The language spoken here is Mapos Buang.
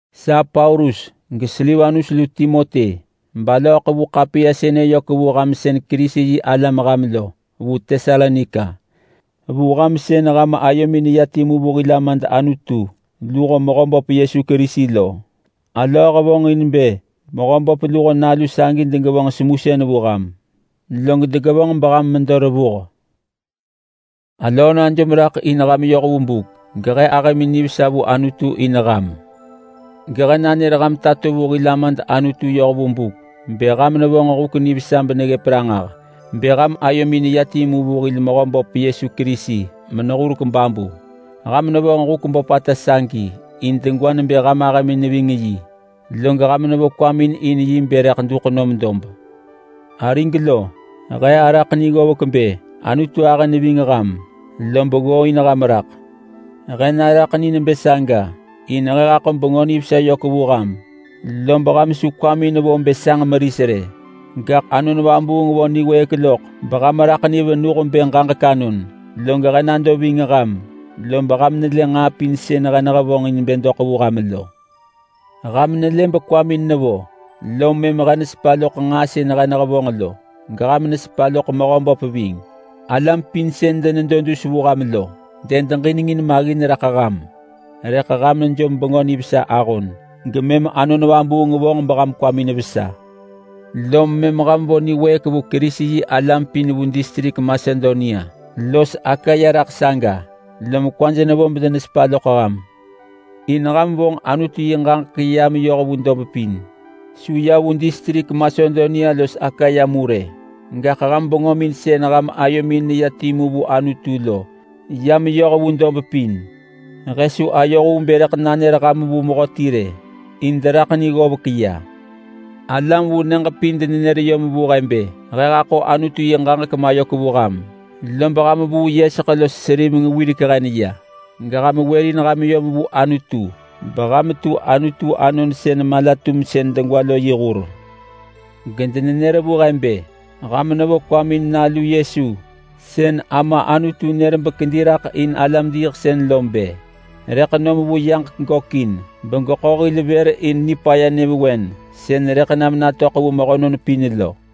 Sa Paulus, geSilvanus lu Timoti, alöö ḳevu ḳapiya sënë yök vu ham sën Kerisi-yi-alam lo vu Tesalonika. Vu ham sën ham ayomin neya timu vu hil Amad Anutu luho Mehöböp Yesu Kerisi lo. Alöö hevonġin bë Mehöböp luho nalu sagi degevonġ semusën vu ham, log degevonġ beham medo revuh. Alöö najom raḳ in ham yoh vu buk gehe ahëmin nivesa vu Anutu in ham. Gehe nër ham tato vu hil Amad Anutu yoh vu buk bë ham nevonġ huk nivesa beneggëp ranġah bë ham ayomin neya timu vu hil Mehöböp Yesu Kerisi menehurek babu. Ham nevonġ huk böpata sagi in degwa nebë ham ahëmin ving yi, log ham nevo kwamin in yi bë rëḳ duḳ nom dob. Arig lo! He araḳ ni ggovek bë Anutu ahë neving ham lob ggooin ham raḳ. He naraḳ ni nebë saga in he haḳo Bengö Nivesa yök vu ham, lob ham su kwamin vo bë sanġ meris rë, gaḳ Anon Vabuung vo niwëëk loḳ beham raḳ ni venuh bë ġaġek anon. Log he nado ving ham, lob ham nelë nġaa pin sën he nehevonġ in bë doḳ vu ham lo. Ham nelë bekwamin nevo, lom mëm ham nesepa loḳ nġaa sën he nehevonġ lo, geham nesepa loḳ Mehöböp ving. Alam pin sën denedo dus vu ham lo dedeġinengin maggin raḳ ham, rëḳ ham jom Bengö Nivesa ahon gemëm Anon Vabuung vonġ beham kwamin vesa. Lom mëm ham vo niwëëk vu Kerisi-yi-alam pin vu distrik Masedonia los Akaya raḳ saga, lom kwaj nevo bedenesepa loḳ ham. In ham vonġ Anutu yi ġaġek ya meyoh vu dob pin. Su ya vu distrik Masedonia los Akaya mu rë, gaḳ ham bengömin sën ham ayomin neya timu vu Anutu lo, ya meyoh vu dob pin. He su ayoh vu bë rëḳ nanër ham vu mehöti rë, in deraḳ ni ggovek ya. Alam vu nyëġ pin denenër yom vu he bë he haḳo Anutu yi ġaġek mayök vu ham, lob ham vuu yeseḳ los seriveng wirek hen ya, geham wërin ham yom vu Anutu beham tu Anutu anon sën mala-tumsën degwa lo yi hur. Gedenenër vu he bë, ham nevo kwamin in Nalu Yesu sën Ama Anutu nër bekedi raḳ in alam-diiḳsën lo bë: Rëḳ nom vu yaġek gökin begeḳo hil vër in nipaya nyëvewen sën rëḳ nam natöḳ vu mehönon pin lo.